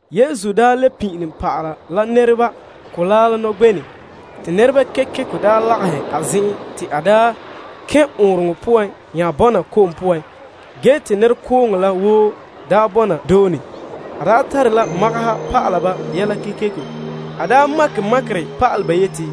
Yesu daa le pin'ilom pa'ala la nɛreba mɔgɔrɛ la nɔgbenɛ te nɛreba kekeko lagahɛ a zen'en te a kɛn' ɔɔnrɔŋɔ poan nya bɔna ko'om poan ge te nɛrekooŋɔ la woo bɔna doone. A tare la magaha pa'alɛ ba yɛla kekeko. A makɛ makerɛ pa'alɛ ba yeti,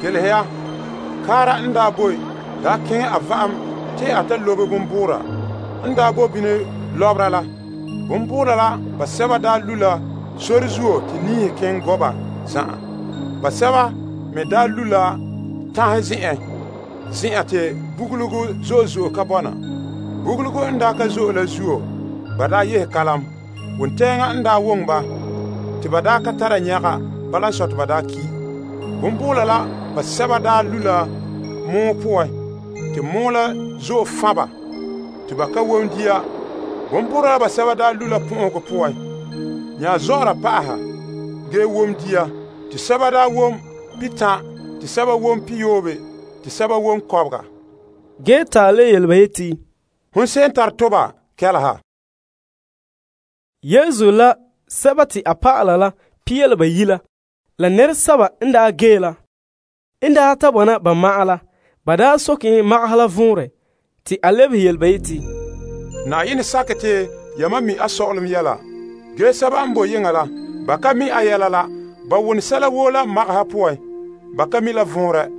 Kelehe ya. Kaara n daa boe daa keŋɛ a va'ame te a lobe a bonbuura. N daa bo bini lɔbera la, bonbuura la basɛba daa lu' sore zuo te niihe kiŋ gɔ' ba zan'an. Basɛba me daa lu' tanhe zen'en, zen'an te tentɔnɔ ka zo'e. Tentɔnɔ n daa ka zo'e la zuo ba daa yehe kalam. Wontɛɛŋa n daa woŋɛ ba te ba ka tare nyɛga, bala n sɔe, te ba daa ki'. Bonbuura la basɛba daa lu' la gɔn'ɔhe poan te gɔn'ɔhe la kpare ba te ba ka wom dia. Bonbuura la basɛba daa lu' la pɔn'ɔhegɔ poan nya zɔ'ɔra pa'aha ge wom dia, te sɛba wom pihitan', te sɛba wom pihiyoobe, te sɛba wom kɔbega. Te a nya yele ba yeti, Hon se'em n tare toba, kɛleha. Yesu la Pia La Bayi' la nɛresɛba n gee la n daa ta bɔna ba ma'an la, ba soke en magaha la vɔnrɛ. Te a lebehe ba yeti, Yenɛ sakɛ te yamam mi' a sɔ'ɔlom yɛla. Ge, sɛba n boe yeŋa la ba wone sɛla woo la magaha poan te ba ka mi' vɔnrɛ la.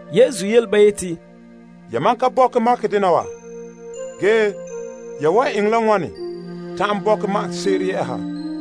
Yesu nya soke ba yeti, Yamam ka bɔkɛ makɛ dena wa? Ge ya wan eŋɛ la wane ta'an bɔkɛ magase'ere yɛ'ɛha?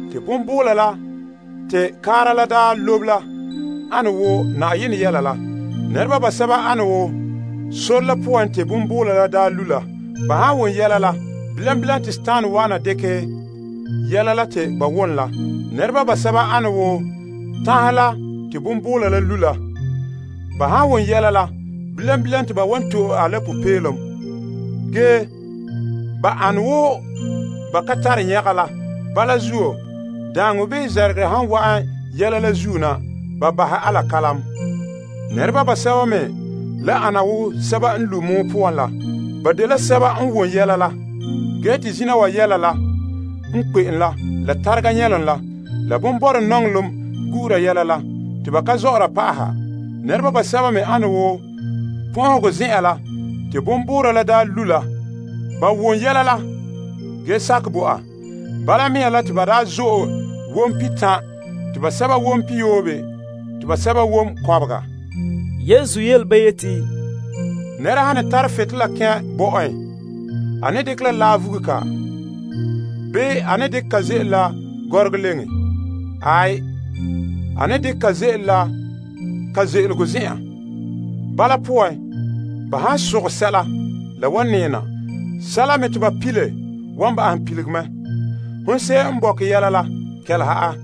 Bonbuura la te kaara la daa lobe la de Yenɛ yelehom la. Nɛreba basɛba ane wo sore la poan te bonbuura la daa lu' la. Ba han wom yelehom la, bilam bilam te Dima wa'ana dekɛ yelehom la te ba wom la. Nɛreba basɛba ane wo tanhe la te bonbuura la lu' la. Ba han wom yelehom la bilam bilam te ba wan to'e a la popeelom. Ge, ba ane wo ba ka tare nyɛga la. Bala zuo, daaŋɔ bii namehegɔ han wa'an yelehom la zuo na, ba bahɛ a la kalam. Nɛreba basɛba me le ana wo sɛba n lu' gɔn'ɔhe poan la. Ba dela sɛba n wom yelehom la, ge te zina wa yɛla la n kpe'em la tarega nyɛlom la bonborɛ nɔŋɔlom gu'ura yelehom la, te ba ka zɔ'ɔra pa'aha. Nɛreba basɛba me ane wo pɔn'ɔhegɔ zen'an la te bonbuura la daa lu' la. Ba wom yɛla la, ge sakɛ bo a. Bala mea la te ba daa zo'e wom pihitan', te basɛba wom pihiyoobe, te basɛba wom kɔbega. Yesu yele ba yeti, Nɛra han ne tara butolela kɛn' bɔ'en, a ne dekɛ la laa vugule ka? Bii a dekɛ ka ze'ele koka leŋen? Aai, a ne dekɛ ka ze'ele la ka ze'elego zen'an. Bala poan, ba han sogɛ sɛla la wan nɛɛ na. Sɛla me te ba pile wan bahɛ pilige mɛ. Hon se'em n bɔkɛ yɛla la, kɛleha a.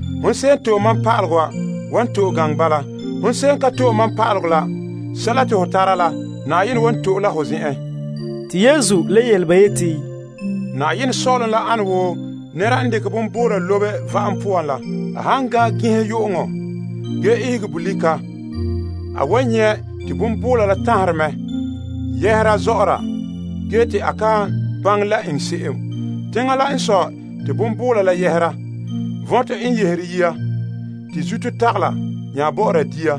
Hon se'em n to'e mam pa'alegɔ wan to'e gaŋɛ bala. Hon se'em n ka to'e mam pa'alegɔ la, sɛla te ho tara la, Na'ayenɛ wan to'e la ho zen'en. Te Yesu le yele ba yeti, Yenɛ sɔ'ɔlom la ana wo nɛra n dekɛ bonbuura lobe va'am poan la. A han gan'an ginha yu'uŋɔ ge ihegera bolika, a wan nyɛ' te bonbuura la taherɛ mɛ yɛha zɔ'ɔra ge te a kan baŋɛ la eŋɛ se'em. Teŋa la n sɔe te bonbuura la yɛhera, vɔntɔ n yɛhera yia, te zuto tagala nya bɔ'ɔra dia.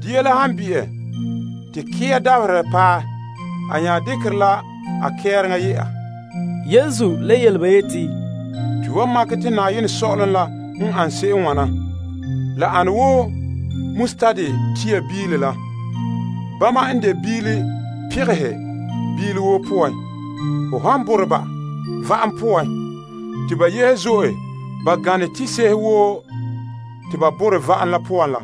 Dia la han bi'e te kɛ'a dabaherɛ paɛ, a nya dekere la a kɛreŋa yɛ'a. Yesu le yele ba yeti, To wan makɛ te Yenɛ sɔ'ɔlom la n ana se'em n wana. La ane wo tia biile pegehe la. Bama n de biile pegehe, biile woo poan. Ho han bore ba va'am poan, te ba yehe zo'e, ba gane tise'ehe woo te ba borɛ va'am la poan la.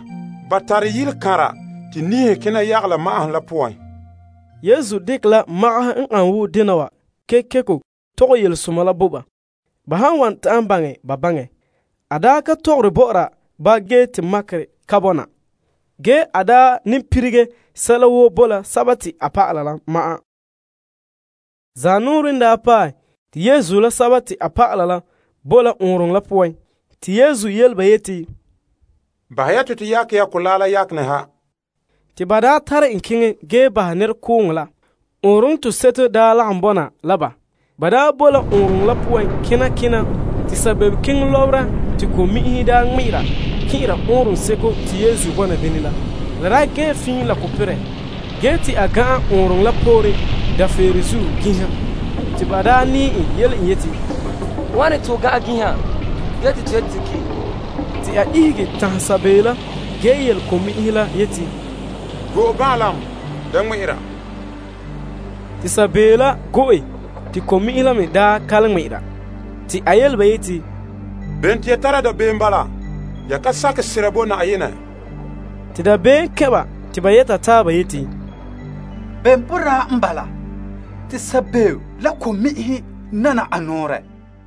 Ba tara yilekanra te niihe kena yagala ma'ahom la poan. Yesu daa dekɛ la magaha n an wo dena wa kekeko tɔgɛ yelesoma la bo ba, ba han wan ta'an baŋɛ, ba baŋɛ. A ka tɔgɔra bɔ'ɔra ba ge te makerɛ ka bɔna. Ge a ne lilige sɛla woo bo la a dɔlɔba la ma'an. Zanɔɔrɛ n paɛ, te Yesu la a dɔlɔba la daa boe la ɔɔnrɔŋɔ la poan te a yele ba yeti, Bahɛ ya te to yakɛ mɔgɔrɛ la yakenɛ ha. Te ba tare en keŋɛ ge bahɛ nɛrekooŋɔ la. Ɔɔnrɔnɔ toseto daa lagom bɔna la ba. Ban boe ɔɔnrɔŋɔ la poan kena kena, te saabeeokeŋɔ lɔbera te ko'mi'inhe ŋmɛ'ɛra kɛn'ɛra ɔɔnrɔŋseko ge te la gee fiin la ko perɛ. Yesu gan'an ɔɔnrɔŋɔ la pooren kɔga dafeere ginha te ba nɛɛ en yele en yeti, Wane te ho gan'an ginha ge te to yeti te ki'? Te a ihege tanhɛ sabeeo la ge yele ko'mi'inhe la yeti, Go'e banlaam! Da ŋmɛ'ɛra! Te sabeeo la daa go'e te ko'mi'inhe la me daa ka le ŋmɛ'ɛra. A yele ba yeti, Bene te ya tara dabeem bala? Ya ka sakɛ sera bo Na'ayenɛ? Dabeem kɛn' ba te ba yɛta taaba yeti, Bem boraa n bala? Te sabeeo la ko'mi'inhe nana a nɔɔrɛ.